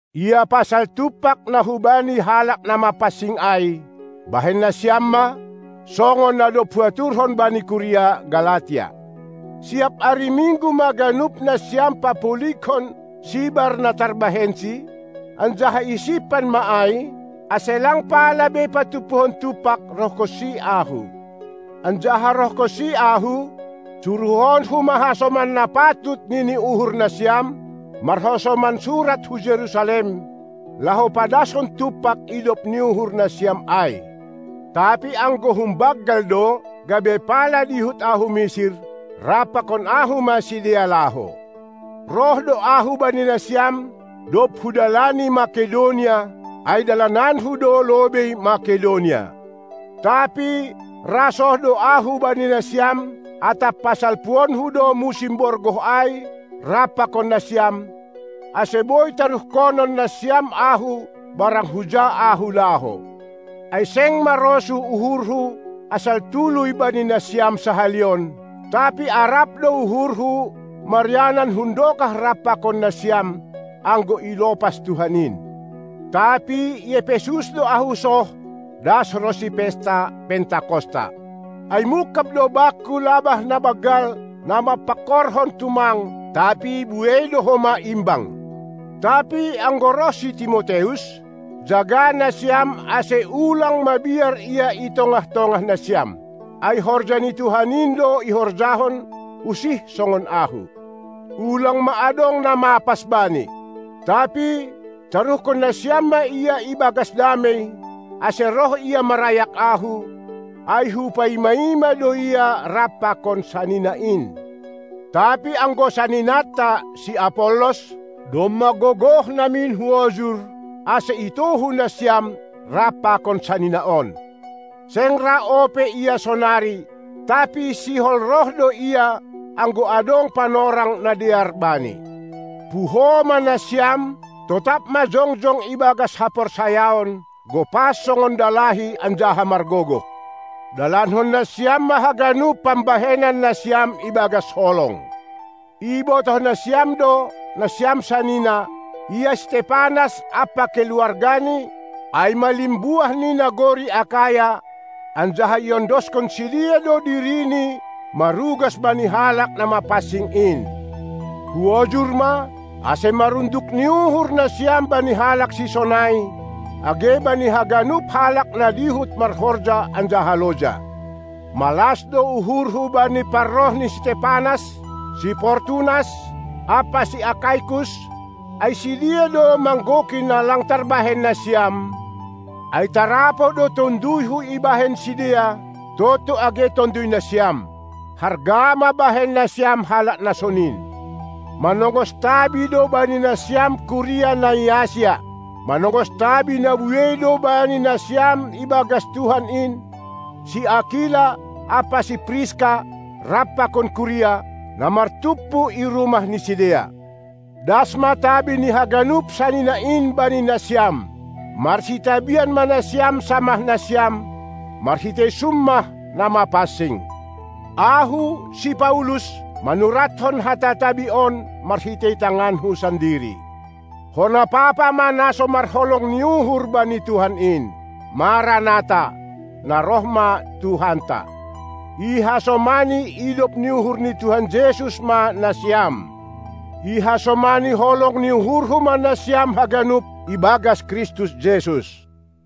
Ia pasal tumpak na hubani halak na mapansing ai, bahen nasiam ma, songon na dob huaturhon bani kuria Galatia. Siap ari Minggu ma ganup nasiam papulighon sibar na tarbahensi, anjaha isimpan ma ai, ase lang pala be patumpuhon tumpak rohhonsi ahu. Anjaha rohhonsi ahu, suruhhonku ma hasoman na patut nini uhur nasiam, marhasoman surat hu Jerusalem, laho padaskon tumpak idop ni uhur nasiam ai. Tapi anggo humbanggal do, gabe pala dihut ahu misir, rap pakon ahu ma sidea laho. Roh do ahu bani nasiam, dob hudalani Makedonia; ai dalananku do lobei Makedonia, tapi ra soh do ahu bani nasiam, atap pasalpuonku do musim borgoh ai rap pakon nasiam, ase boi taruhkonon nasiam ahu barang huja ahu laho. Ai seng marosuh uhurhu asal tuluy bani nasiam sahali on, tapi arap do uhurhu marianan hundokah rap pakon nasiam, anggo ilopas Tuhan in. Tapi i Epesus do ahu soh, das ronsi pesta Pentakosta. Ai mungkab do bakku labah na banggal, na marpangkorhon tumang, tapi buei do homa imbang. Tapi anggo roh si Timoteus, jaga nasiam ase ulang mabiar ia i tongah-tongah nasiam. Ai horja ni Tuhan in do ihorjahon, usih songon ahu. Ulang ma adong na mapas bani. Tapi taruhkon nasiam ma ia ibagas damei, ase roh ia marayak ahu, ai hupaima-ima do ia rap pakon sanina in. Tapi anggo saninanta, si Apollos, domma gogoh namin huojur, ase itohu nasiam rap pakon sanina on. Seng ra ope ia sonari, tapi sihol roh do ia, anggo adong panorang na dear bani. Puho ma nasiam; totap ma jongjong ibagas haporsayaon, gopas songon dalahi anjaha margogoh. Dalankon nasiam ma haganup pambahenan nasiam ibagas holong. Ibotoh nasiam do, nasiam sanina, ia si Stepanas ampa keluargani, ai ma limbuah ni nagori Akaya, anjaha iondoskon sidea do dirini marugas bani halak na mapansing in. Huojur ma, ase marunduk ni uhur nasiam bani halak sisonai, age bani haganup halak na dihut marhorja anjaha loja. Malas do uhurhu bani parroh ni si Stepanas, si Fortunas ampa si Akaikus; ai sidea do manggoki na lang tarbahen nasiam, ai tarapoh do tonduyhu ibahen sidea, tontu age tonduy nasiam. Harga ma bahen nasiam halak na sonin. Manongos tabi do bani nasiam kuria na i Asia. Manongos tabi na buei do bani nasiam ibagas Tuhan in, si Akila ampa si Priska rap pakon kuria, na martumpu i rumah ni sidea. Das ma tabi ni haganup sanina in bani nasiam. Marsitabian ma nasiam samah nasiam, marhitei summah na mapansing. Ahu, si Paulus, manuratkon hata tabi on marhitei tanganku sandiri. Hona papa ma na so marholong ni uhur bani Tuhan in! Maranata (Na roh ma Tuhanta)! Ihasomani idop ni uhur ni Tuhan Jesus ma nasiam! Ihasomani holong ni uhurhu ma nasiam haganup ibagas Kristus Jesus!